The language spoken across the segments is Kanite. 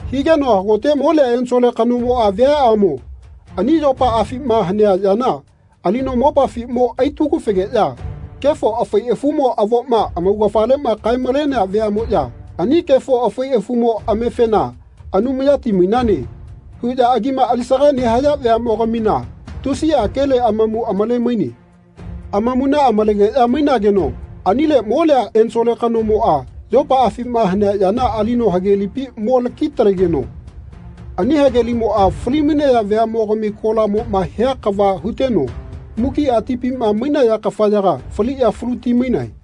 Higeno hagote molia ensole kanomoꞌa viaꞌamo ani yopaꞌafima hanea yana alino mopafi mo aitagu-fegeꞌya kefo afai afumo avoma amaugafaleꞌma kae-malenea veaꞌmoꞌya ani kefo afai afumo amefena “Anumayati mainane.” huꞌya agima alisaga nehaya veaꞌmogamina tusiꞌa kele amamu amale-maine. Amamuna amalegeꞌya mainageno anile molia ensole kanomoꞌa yopaꞌafima hanea yana alino hagelipi mo laki-talegeno ani hagelimoꞌa falimainaya veaꞌmogami kolamoꞌma hia kava huteno mukiꞌa tipima mainaya kafayaga faliꞌya faluti-mainae.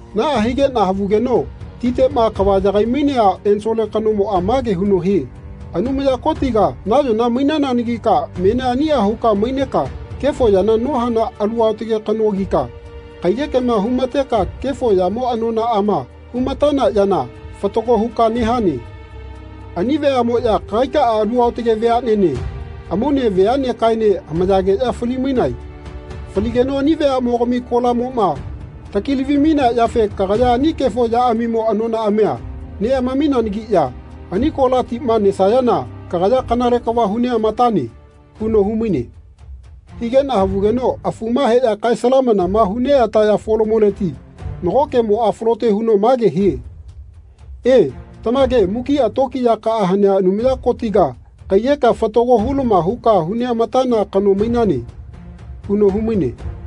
Naꞌa higeꞌna havugeno titeꞌma kava yagai-mainea ensole kanomoꞌa mage huno hie “Anumaya Kotiga nayona mainananagika menia aniꞌa huka maineka kefo yana nohana Alu aotage kanogika kaiyekema humateka kefo yamo anonaꞌama hu-matana yana fatago huka nehane. Ani veaꞌmoꞌya kagaikaꞌa alu aotage veaꞌnene amaune veaꞌnekaene hamayageꞌya fali-mainae. Faligeno ani veaꞌmogami kolamoꞌma takilavi-mainea yafe kagaya ani kefo yaꞌamimo anonaꞌamia neꞌamaminanagiꞌya ani kola tima nesayana kagaya kanale kava hu neꞌmatane.” huno humaine. Higeꞌna havugeno afuma heꞌya kae salamanama hu neꞌataya folamoleti nago kemoꞌa falote huno mage hie “E, tamage mukiꞌa tokiyakaꞌa hanea Anumaya Kotiga kaiyekea fatago hulama huka hu neꞌamatana kano mainane.” huno humaine.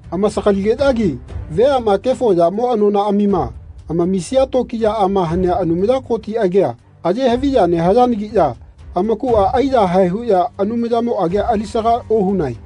Amasagaligeꞌyagi veaꞌma kefo yamo anonaꞌamima amamisia tokiyaꞌama hanea Anumaya Koti agia aye haviya nehayanagiꞌya amakuꞌa aiyahae huꞌya Anumayamo agia alisaga ohunae.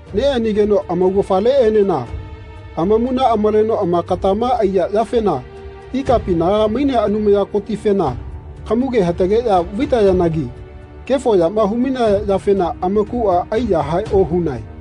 Neꞌanigeno amaugafaleꞌenena amamuna amaleno amakatama aiya yafena ikapinaga mainea Anumaya Kotifena kamuge hatageꞌya vaitayanagi kefo yama humainaya yafena amakuꞌa aiyahae ohunae.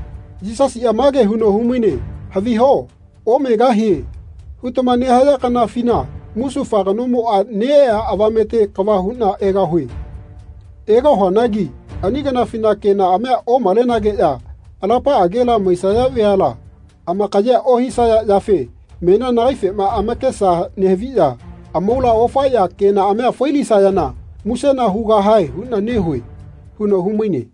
Yisasiꞌa mage huno humaine “Haviho ‘Omegahie.’ hutama nehaya kanafina musufa kanomoꞌa neꞌea avamete kava huꞌna egahue. Egahuanagi ani kanafina kenaꞌamia omalenageꞌya alapaꞌagela maisaya veala amakayea ohisaya yafe menia nagaifema amakesa nehaviꞌya amaula ofaeꞌya kenaꞌamia fai-lisayana musena hugahae huꞌna nehue.” huno humaine.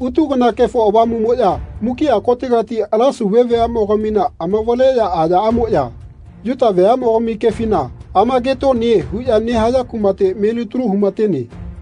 Utu kana Kefo Avamuꞌmoꞌya mukiꞌa kotegati ala Sauve veaꞌmogamina amavaleꞌya ayaꞌamoꞌya Yuta veaꞌmogami kefina Amagetoni huꞌya nehaya kumate melitalu humatene.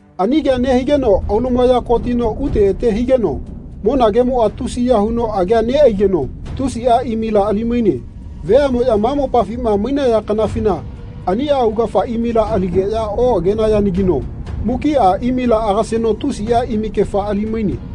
Ani kea nehigeno aulumaya kotino ute ete higeno monagemoꞌa tusiya huno agea neꞌaigeno tusiꞌa imila ali-maine. Veaꞌmoꞌya ma mopafima mainaya kanafina aniꞌa augafa imila aligeꞌya oꞌagenayanagino mukiꞌa imila agaseno tusiꞌa imikefa ali-maine.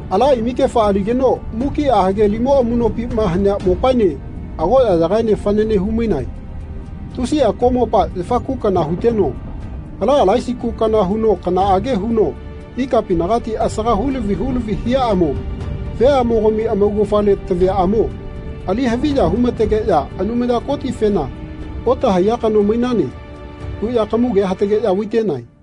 Ala imikefa aligeno mukiꞌa hagelimo amuꞌnopima hanea mopaene agoꞌyagaene fanane humainae. Tusiꞌa koꞌmopa, yafa ku kana huteno, ala alaisi ku kana huno kanaꞌage huno ikapinagati asaga hulavi hulavi hiaꞌamo veamogami amaugafale taviaꞌamo ali haviya humategeꞌya Anumaya Kotifena “Otahaiya kano mainane.” huꞌya kamugea hatageꞌya vaitenae.